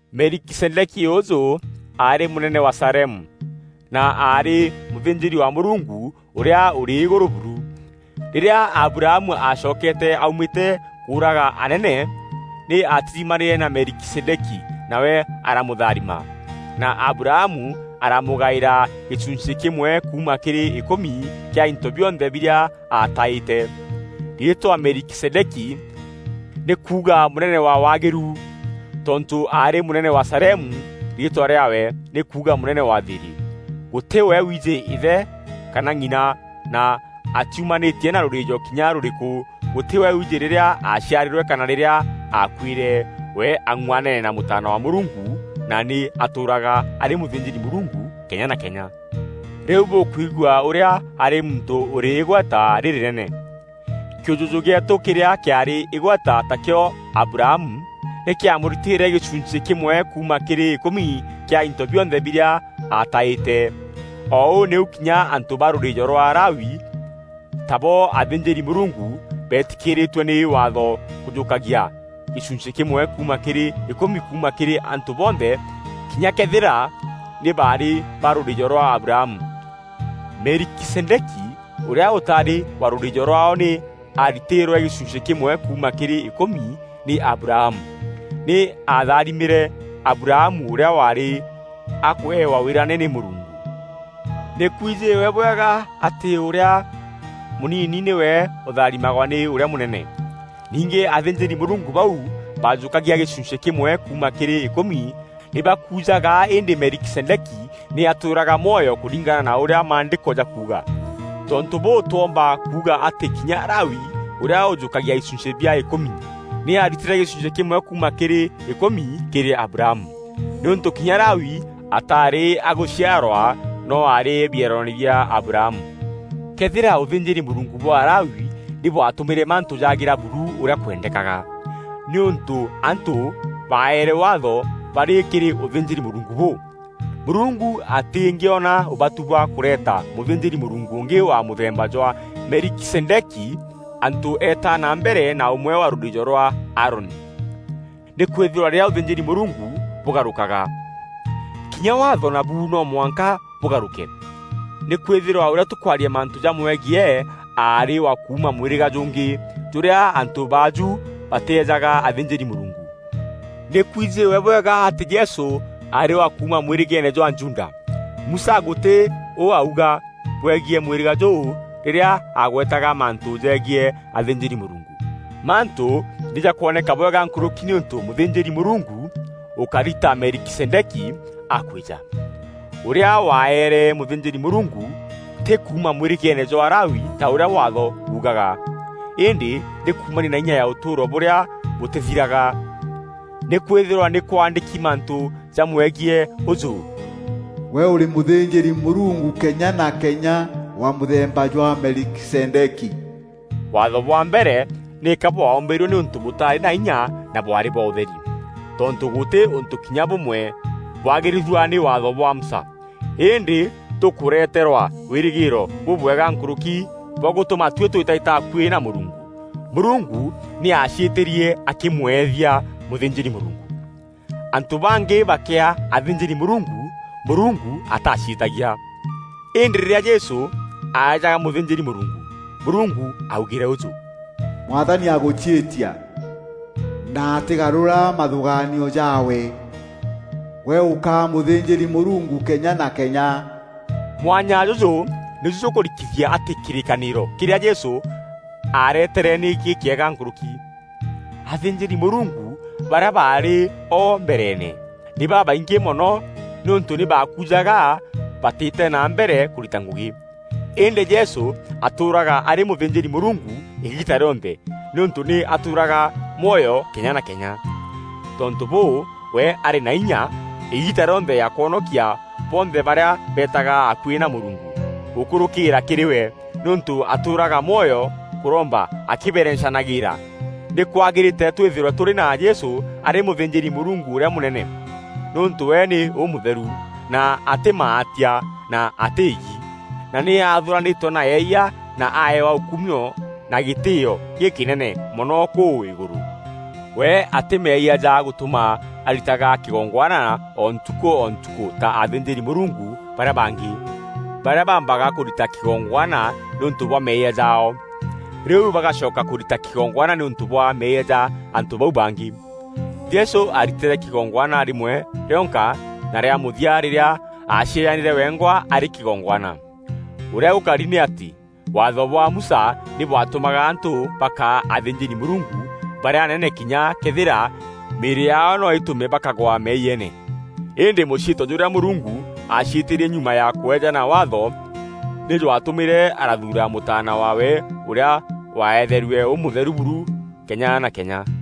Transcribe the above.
Melikizedeki ûûjû aarî mûnene wa Salemu na aarî mûthînjîri wa Mûrungu Ûrîa Ûrî Îgûrû buru. Rîrîa Abrahamu aacokete aumîte kûûraga anene, nî aatirimanîre na Melikizedeki nawe aramûtharima, na Abrahamu aramûgaîra gîchunchî kîmwe kuuma kîrî îkûmi kîa into bionthe birîa aataîte. Riîtwa Melikizedeki, nî kuuga Mûnene wa waagîru. Tontû aarî mûnene wa Salemu, riîtwa rîaawe nî kuuga Mûnene wa thîîrî. Gûtî we wiijî îthe kana ng'ina na atiumanîtie na rûrîîjo kinya rûrîkû. Gûtî we wiijî rîrîa aaciarîrwe kana rîrîa aakuîre. We ang'uanene na Mûtaana wa Mûrungu na nî atûûraga arî mûthînjîri-Mûrungu kenya na kenya. Rîu bûkwigua ûrîa aarî muntû ûrî îgweta rîrînene. Kîûjûjû gîeetû kîrîa kîaarî îgweta, takîo Abrahamu nî kîamûritîîre gîchunchî kîmwe kuuma kîrî îkûmi kîa into bionthe birîa aataîte. O ûu nîu kinya antû ba rûrîîjo rwa Lawi, tabo athînjîri-Mûrungu, beetîkîrîîtue nî Waatho kûjûkagia gîchunchî kîmwe kuuma kîrî îkûmi kuuma kîrî antû bonthe kinya këethîra nî baarî ba rûrîîjo rwa Abrahamu. Melikizedeki ûrîa ûtaarî wa rûrîîjo rwaao nî aaritîîrwe gîchunchî kîmwe kuuma kîrî îkûmi nî Abrahamu. Nî aatharimîre Abrahamu ûrîa waarî akweewa wîrane nî Mûrungu. Nî kwijîwe bwega atî ûrîa mûnini nîwe ûtharimagwa nî ûrîa mûnene. Ningî athînjîri-Mûrungu bau bajûkagia gîchunchî kîmwe kuuma kîrî îkûmi nî bakujaga îndî Melikizedeki nî atûûraga mwoyo kûringana na ûrîa Maandîko jakuuga. Tontû bûû, twoomba kuuga atî kinya Lawi, ûrîa ûjûkagia ichunchî bia îkûmi, nî aaritîre gîchunchî kîmwe kuuma kîrî îkûmi kîrî Abrahamu, nîûntû kinya Lawi ataarî agûciarwa noo aarî bieroone bia Abrahamu. Këethîra ûthînjîri-Mûrungu bwa Alawi nî bwatûmîre mantû jaagîra buru ûrîa kwendekaga, nîûntû antû baaerwe Waatho barî kîrî ûthînjîri-Mûrungu bûu, Mûrungu atîngîona ûbatû bwa kûreeta mûthînjîri-Mûrungu ûngî wa mûthemba jwa Melikizedeki antû eeta na mbere na ûmwe wa rûrîîjo rwa Aaroni. Nîkwîthîrwa rîrîa ûthînjîri-Mûrungu bûgarûkaga, kinya Waatho nabu no mwanka bûgarûke. Nîkwîthîrwa ûrîa tûkwaria mantû jamwegiî aarî wa kuuma mwîrîga jûngî, jûrîa antû baajû batîejaga athînjîri-Mûrungu. Nî kwijîwe bwega atî Jesû aarî wa kuuma mwîrîgeene jwa Juda. Musa gûtî u auga bwegiî mwîrîga jûu rîrîa agwetaga mantû jegiî athînjîri-Mûrungu. Mantû nî jakwoneka bwega nkûrûki nîûntû mûthînjîri-Mûrungu ûkari ta Melikizedeki akwîja, ûrîa waaere mûthînjîri-Mûrungu, tî kuuma mwîrîgeene jwa Lawi ta ûrîa Waatho buugaga, îndî nî kuumania na inya ya ûtûûro bûrîa bûtîthiraga. Nîkwîthîrwa nî kwaandîki mantû jamwegiî ûjû, “Gwe ûrî mûthînjîri-Mûrungu kenya na kenya, wa mûthemba jwa Melikizedeki.” Waatho bwa mbere nîka bwaûmbîrue nîûntû bûtarî na inya na bwaarî bwa ûtheri. Tontû gûtî ûntû kinya bûmwe bwagîrîthua nî Waatho bwa Musa. Îndî tûkûreterwa wîrîgîîro bûbwega nkûrûki bwa gûtûma tuî tûîtaîta akuî na Mûrungu. Mûrungu nî aaciîtîrie akîmwethia mûthînjîri-Mûrungu. Antû bangî bakîaa athînjîri-Mûrungu, Mûrungu ataciîtagia. Îndî rîrîa Jesû aeejaga mûthînjîri-Mûrungu, Mûrungu aaugîre ûjû: “Mwathani agûciîtia, na atîgarura mathûgaanio jaawe: ‘Gwe ûkaa mûthînjîri-Mûrungu kenya na kenya!’” Mwanya jûjû nîju jûkûrikithia atî kîrîkanîro kîrîa Jesû aaretere nî gîkîega nkûrûki. Athînjîri-Mûrungu barîa baarî o mbereene nî babaingî mono nîûntû nî baakujaga batîte na mbere kûrita ngûgî. Îndî Jesû atûûraga arî mûthînjîri-Mûrungu îgiita rîonthe nîûntû nî atûûraga mwoyo kenya na kenya. Tontû bûu, we arî na inya îgiita rîonthe ya kwonokia bonthe barîa beetaga akuî na Mûrungu gûkûrûkîra kîrî we, nîûntû atûûraga mwoyo kûromba akîberencanagîîra. Nîkwagîrîte twîthîrwe tûrî na Jesû arî mûthînjîri-Mûrungu ûrîa mûnene, nîûntû we nî ûmûtheru, na atî maatia, na atî îgi, na nî athûûranîtwe na eeyia na aeewa ûkumio na gîtîîo gîkînene mono kûu îgûrû. We atî meeyia ja gûtûma aritaga kîgongwana o ntukû o ntukû ta athînjîri-Mûrungu barîa bangî, barîa baambaga kûrita kîgongwana nîûntû bwa meeyia jaao, rîu bagacoka kûrita kîgongwana nîûntû bwa meeyia ja antû bau bangî. Jesû aaritîre kîgongwana rîmwe rionka na rîa mûthia rîrîa aacieejanîre wengwa arî kîgongwana. Ûrîa gûkari nî atî Waatho bwa Musa nî bwatûmaga antû bakaa athînjîri-Mûrungu barîa anene kinya këethîra mîîrî yaao noo îtûme bakagwa meeyiene. Îndî mûciîtio jûrîa Mûrungu aaciîtîrie nyuma ya kweejana Waatho, nî jwatûmîre arathuura Mûtaana waawe ûrîa waeetherue ûmûtheru buru kenya na kenya.